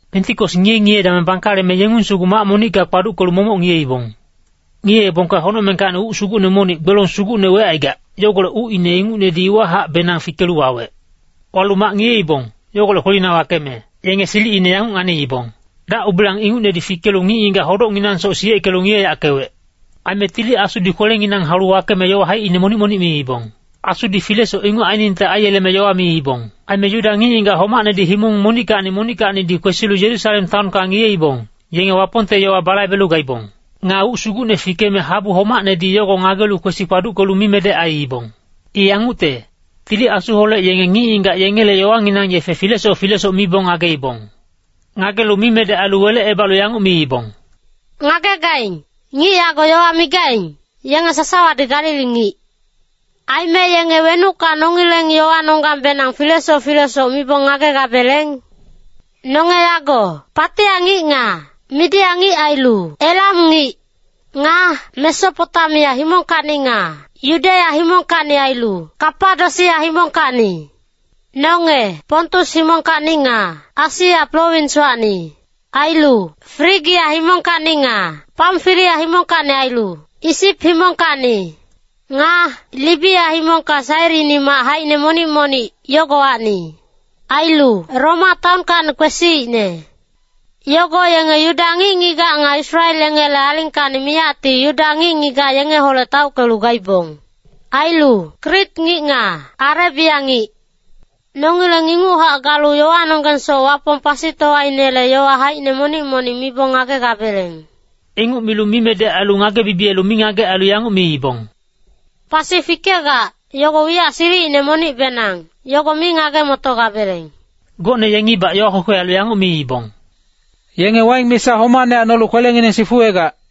Pentikos ngiye-ngiye dameng bangkaleme yengung sugu mac monicka kpaduckelu momoc ngiyeibong. Ngiyeebongka honocmengkacni uc sugucne monic gbelong sugucne wecaigac, yogolec ucine ingucnedi iwahacbenang fikelu wawec. Walu mac ngiyeibong, yogolec kwelina wakeme yenge silicine yanguc nganiibong. Dac-ubilang ingucnedi fikelu ngic-ngigac hodocnginangsoc siyeckelu ngiyeyackewec. Aime Tili Asudi kwelenginang haulu wakeme yowa haicine monic-monic miibong. Asudi filesoc inguc ainingte aiyeleme yowa miibong. Aime Yuda ngic-ngigac homacnedi himong monickacni monickacnidi kwesilu Yerusalem taonka ngiyeibong, yenge Wapongte yowa balaibelu gaibong. Nga uc sugucne fikeme habu homacnedi yogo ngagelu kwesi kpaduckelu mimedec aiibong. I yangucte, Tili Asuholec yenge ngic-ngigac yengele yowanginang yefe filesoc filesoc mibong ngageibong. Ngagelu mimedec ailu welecebalu yanguc miibong, “Ngagegaing, ngic yago yowa migaing, yenge sasawadi Galili ngic. Aime yenge wenucka nongileng yowanonggangbenang filesoc filesoc mibong ngagegabeleng? Nonge yago Patia ngic nga Midia ngic ailu Elam ngic. Nga Mesopotamia himongkacni nga Yudeya himongkacni ailu Kapadosia himongkacni. Nonge Pontus himongkacni nga Asia prowinswacni. Ailu Frigia himongkacni nga Pamfilia himongkacni ailu Isip himongkacni. Nga Libia himongka Sairini mac haicine monic monic, yogowacni. Ailu Roma taonkacni kwesiicne. Yogo yenge Yuda ngic-ngigac nga Israel yengele alingkacni miyacti Yuda ngic-ngigac yengeholec taockelu gaibong. Ailu Krit ngic nga Arebia ngic. Nongileng inguchac galu yowanonggangsoc Wapong pasitowainele yowa haicine monic-monic mibong ngagegabeleng.” Inguc milu mimedec ailu ngage-bibiyelu mingagec ailu yanguc miibong, “Pasi fikegac, yogo wiyac silicine monicbenang, yogo mi ngage-motogabeleng.” Gocne yengibac yowa kwekwe ailu yanguc miibong, “Yenge waing misa homacne nolu kwelengineng sifuwegac.”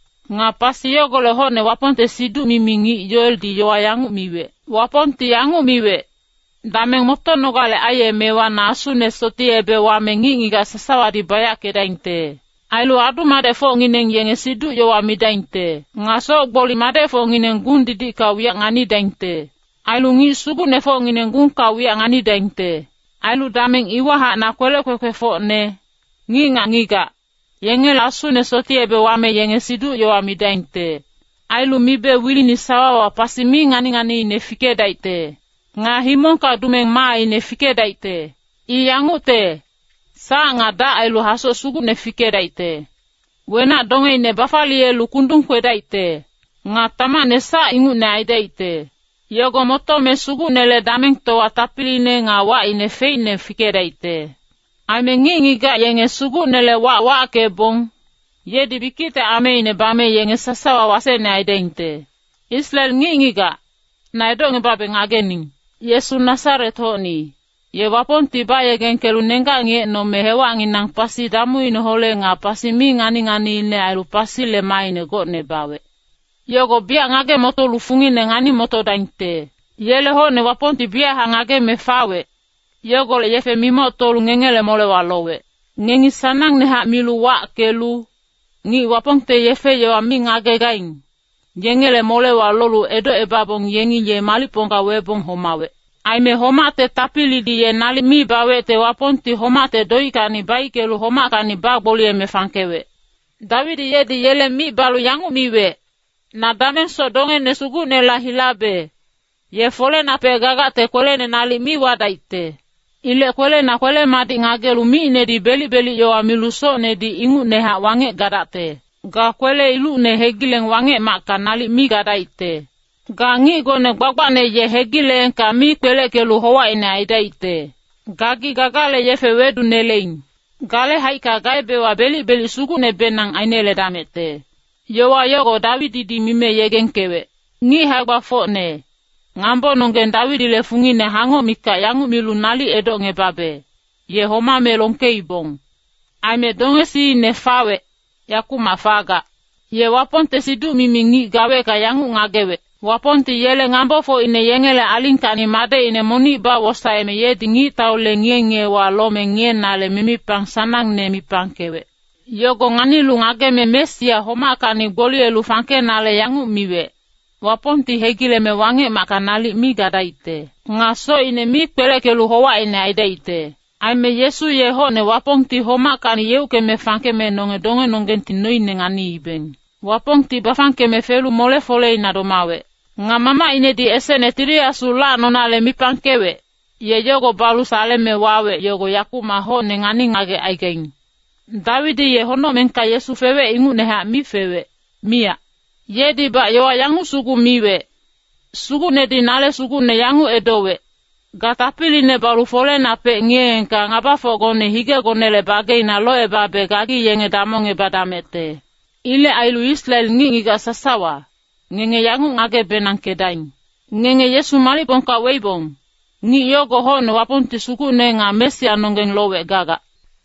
Nga pasi yogolec hocne Wapongte siduc-mimi ngic Yoeldi yowa yanguc miwec, ‘Wapongti yanguc miwec, dameng motonogale aiyemewa na Asune sotiyebe wame ngic-ngigac sasawadi bayackedaingte. Ailu adu-madecfocngineng yenge siduc-yowa midaingte. Nga soc-gboli madecfocngineng gung-didicka wiyac nganidaingte. Ailu ngic sugucnefocngineng gungka wiyac nganidaingte. Ailu dameng iwahac na kwelec kwekwefocne, ngic nga ngigac, yengela Asune sotiyebe wame yenge siduc-yowa midaingte. Ailu mibe wilini sawawa pasi mi ngani-nganiine fikedaicte. Nga himongka dumeng maaine fikedaicte. I yangucte, sac nga dac ailu hasoc sugucne fikedaicte. Wenac-dongeine bafaliyelu kundung kwedaicte. Nga tamacne sac ingucne aidaicte. Yogo motome Sugucnele damengtowa tapiliine nga wacine feicne fikedaicte. Aime ngic-ngigac yenge Sugucnele wac wackebong, yedi bikicte ameine bame yenge sasawa wasecne aidaingte.’ “Israel ngic-ngigac, na edocngebabe ngagening. Yesu Nasaret-hocni, ye Wapongti bayegengkelu nenggac ngiyecnome hewacnginang pasi damuineholec nga pasi mi ngani-nganiine ailu pasile maaine gocne bawec. Yogo biyac ngage-motolu fungine ngani-motodaingte. Yele hocne Wapongti biyachac ngageme fawec, yogolec yefe mimoctolu ngengele molewa lowec. Ngengi sanangnehac milu wackelu, ngic Wapongte yefe-yowa mi ngagegaing, yengele molewa lolu edocebabong yengi ye malicpongka webong homawec. Aime homacte tapilidi ye nalic mi bawecte Wapongti homacte doickacni baickelu homackacni bagboliyeme fangkewec. Dawidi yedi yele mic balu yanguc miwec, ‘Na damengsoc dongene Sugucnela hilabe; ye folenapec gagacte kwelene nalic mi wadaicte. Ilec kwelena kwele-madic ngagelu micnedi belic-belic yowa milu socnedi ingucnehac wangec gadacte. Ga kwele-ilucne hegileng Wangec-macka nalic mi gadaicte. Ga ngicgone gbagbacne ye hegileengka mi kpeleckelu howacine aidaicte. Gagi gagale yefe weduneleing. Gale haicka gaebewa belic-belic sugucnebenang aineledamecte.’ Yowa yogo Dawididi mime yegengkewec. “Ngic hae-gbafocne, ngambononggeng Dawidile fungine hangoc mikac yanguc milu nalic edocngebabe, ye homame longkeibong. Aime dongesiine fawec, yakumac fagac. Ye Wapongte siduc-mimi ngic gawecka yanguc ngagewec. ‘Wapongti yele ngambofocine yengele alingkacni madecine monic bawosaeme yedi ngictaule ngiye-ngiyewa lome ngiyenale mimipang sanangne mipangkewec.’ Yogo nganilu ngageme Mesia homackacni gboliyelu fangkenale yanguc miwec, ‘Wapongti hegileme Wangec-macka nalic mi gadaicte. Nga socine mi kpeleckelu howacine aidaicte.’ Aime Yesu ye hocne Wapongti homackacni yeuckeme fangkeme nonge dongenonggengti noine nganiibeng. Wapongti bafangkeme felu mole-foleina domawec. Nga Mamacinedi esecne Tili Asu lacnonale mipangkewec, ye yogo balu saleme wawec yogo yakumac hocne ngani-ngagec aigaing. Dawidi ye honocmengka Yesu fewec ingucnehac mi fewec, miyac. Yedibac yowa yanguc sugu miwec, ‘Sugucnedi nale Sugucne yanguc edowec, “Ga tapiline balu folenapec ngiyeengka ngabafocgone higegonele bageina locebabe gagi yenge damongebadamecte.” ’ Ilec ailu Israel ngic-ngigac sasawa, ngenge yanguc ngage-benangkedaing. Ngenge Yesu malicpongka weibong, ngic yogo hocne Wapongti Sugucne nga Mesianonggeng lowec gagac.”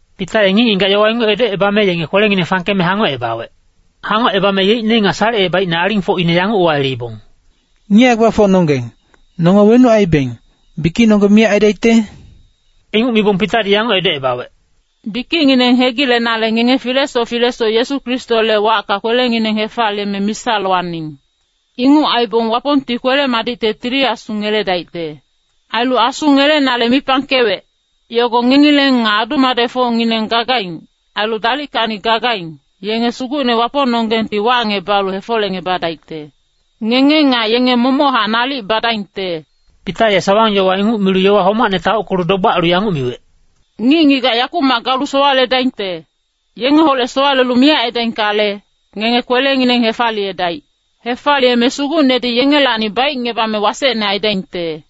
Pita ye ngic-ngigac yowa inguc edocebame yenge kwelengineng fangkeme hangocebawec. Hangocebame yeicne nga salecebaicne alingfocine yanguc uwayeleibong, “Ngic hae-gbafocnonggeng, nonge wenuc aibeng, bikicnonggeng miyac aidaicte?” Inguc mibong Pitadi yanguc edocebawec, “Bikicngineng hegilenale ngenge filesoc filesoc Yesu Kristole wacka kwelengineng hefaliyeme misa lowaning. Inguc aibong Wapongti kwele-madicte Tili Asu ngeledaicte. Ailu Asu ngelenale mipangkewec, yogo ngengileng nga adu-madecfocngineng gagaing, ailu dalickacni gagaing, yenge Sugucne Wapongnonggengti wacngebalu hefolecngebadaicte. Ngenge nga yenge momochac nalic badaingte.” Pita ye sawang-yowa inguc milu yowa homacne taockelu dogbac ailu yanguc miwec, “Ngic-ngigac yakumac galu sowaledaingte, yengeholec sowalelu miyac aidaingkale, ngenge kwelengineng hefaliyedaic. Hefaliyeme Sugucnedi yengelacni baicngebame wasecne aidaingte!”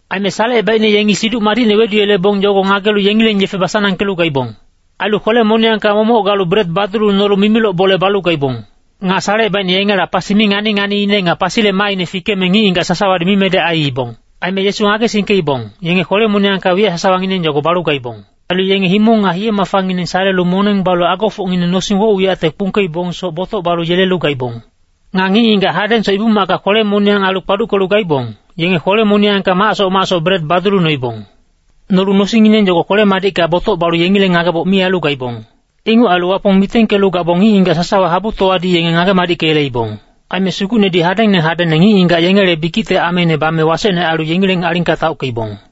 Aime salecebaicne yengi Siduc Madicne weduyelebong yogo ngagelu yengileng yefe basanangkelu gaibong. Ailu kwele-moniyangka momoc galu bret badulu nolu mimiloc bole balu gaibong. Nga salecebaicne yengela pasi mi ngani-nganiine nga pasile maaine fikeme ngic-ngigac sasawadi mimedec aiibong. Aime Yesu ngagesingkeibong, yenge kwele-moniyangka wiyac sasawangineng yogo balu gaibong. Ailu yenge himong nga hiye-mafangineng salelu moneng balu agofocngineng nosing woc-wiyacte kpungkeibongsoc botoc balu yelelu gaibong. Nga ngic-ngigac hadengsoc Ibu-macka kwele-moniyang ailu kpaduckelu gaibong, yenge kwele-moniyangka macsoc macsoc bret badulu noibong. Nolu nosingngineng yogo kwele-madicka botoc balu yengileng ngageboc mi ailu gaibong. Inguc ailu Wapong mitengkelu gabong ngic-ngigac sasawa habutowadi yenge ngage-madickeyeleibong. Aime Sugucnedi hadengne hadengne ngic-ngigac yengele bikicte ameine bame wasecne ailu yengileng alingka taockeibong.